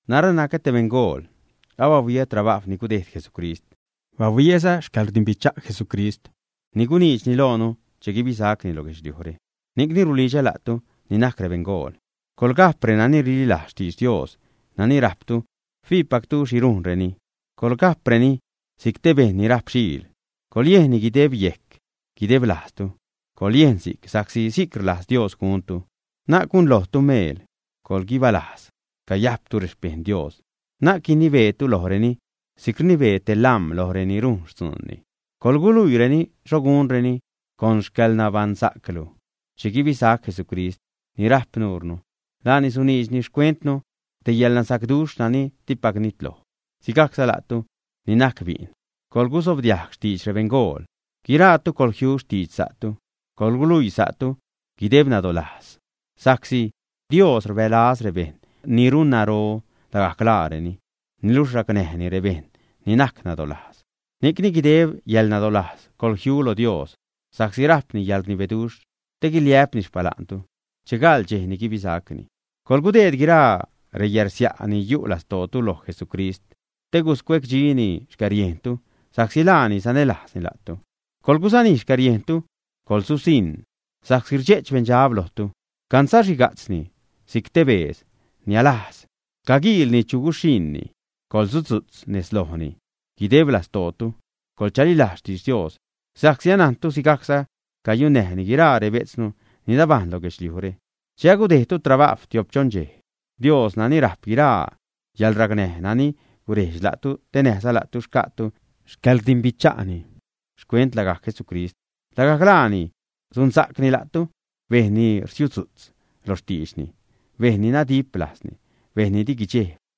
Narä nacä te beṉgool, bahuiä trabajw ni gudejd Jesucrist, bahuiäza xcäḻrdimbicha' Jesucrist ni guniidxni loonu che guibisacni lo guedxliujre. Ni'cni rulidxä la'tu ni najc rebeṉgool, coḻgajp renani rililajz xtidx Dios nani rajptu fiipactu xhi rujnreni. Coḻga'preni si'c te bejṉ ni rajp xiil, coḻyejnni guideb yejc, guideb lajztu. Coḻyejn si'c sa'csi si'c rlajz Dios guntu, na'c gunlojtu meel. Coḻguibalajz cayajptu rexpejṉ Dios. Na'c guinibeetu lojreni si'c rnibee te lam̲ loj reni rujn xtzuunni, coḻguluiireni xho gunreni con xcäḻnabaṉsa'clu. Che guibisac Jesucrist, ni rajp nuure, laani suniidxni xcuentnu, te yäḻnasacduxh nani dipac nitloj. Sigajcza la'tu ni najc bi'n, coḻgusobdiajg xtidx rebeṉgool. Guiraatu coḻjiu xtidx sa'tu, coḻguluii sa'tu guideb nadolajz. Sa'csi: Dios rbälaz rebejṉ ni runnaro lagajc laareni, niluxh racnäjni rebejṉ ni najc nadolajz. Ni'cni guideb yäḻnadolajz coḻjiu lo Dios sa'csi rajpni yäḻrnibeduxh, te guiliä'pni xpala'ntu che gaḻ dxej ni guibisacni. Coḻgudeed guiraa reyärsia' ni yu' lastootu lo Jesucrist te guscuecdxini xcäriejntu sa'csi laani sanälajzni la'tu. Coḻgusanij xcäriejntu, coḻsusiṉ sa'csi rdxe'ch beṉdxab lojtu, cansaxhiga'tzni si'c te beedz nialajz, caguiilni chu guxhiṉni. Coḻsudzu'tz nez lojni, guideb lastootu coḻchalilajz xtidx Dios, sa'csi anajntu sigajcza cayunnäjni guiraa rebetznu ni nabajṉ lo guedxliujre. Che agudejdtu trabajw tiop-choṉ dxej, Dios nani rajp guiraa yäḻracnäj, nani gurejdx la'tu te näjza la'tu xca'tu xcaḻrdimbicha'ni xcuent lagajc Jesucrist, lagajc laani sunsa'cni la'tu, bejṉ ni rsiudzu'tz lo xtiidxni, bejṉ ni nadip lajzni, bejṉ ni di guidxejb.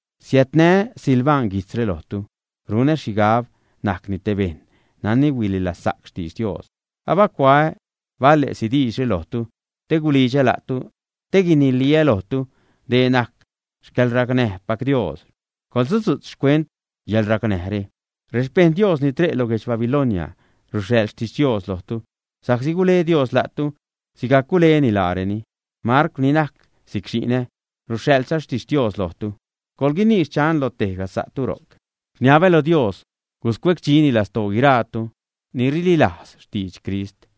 Siädnä Silvan guijtzre lojtu. Runä xhigab najcni te bejṉ nani huililazsa'c xtidx Dios. Abacuaä bale'si diidxre lojtu te gulidxä la'tu, te guiniliä lojtu dee najc xcäḻracnäjpac Dios. Coḻsudzu'tz xcuent yäḻracnäjre. Rexpejṉ Dios ni re' lo guedx Babilonia ruxhaḻ xtixtios lojtu sa'csi gule Dios la'tu sigajc guleni laareni. Marcw, ni najc si'c xi'nä, ruxhaḻza xtixtios lojtu. Coḻguinii “xchan” lo tejga sa'tu ro'c. Rniabä lo Dios guscuecdxini lastoo guiraatu ni rililajz xtidx Crist.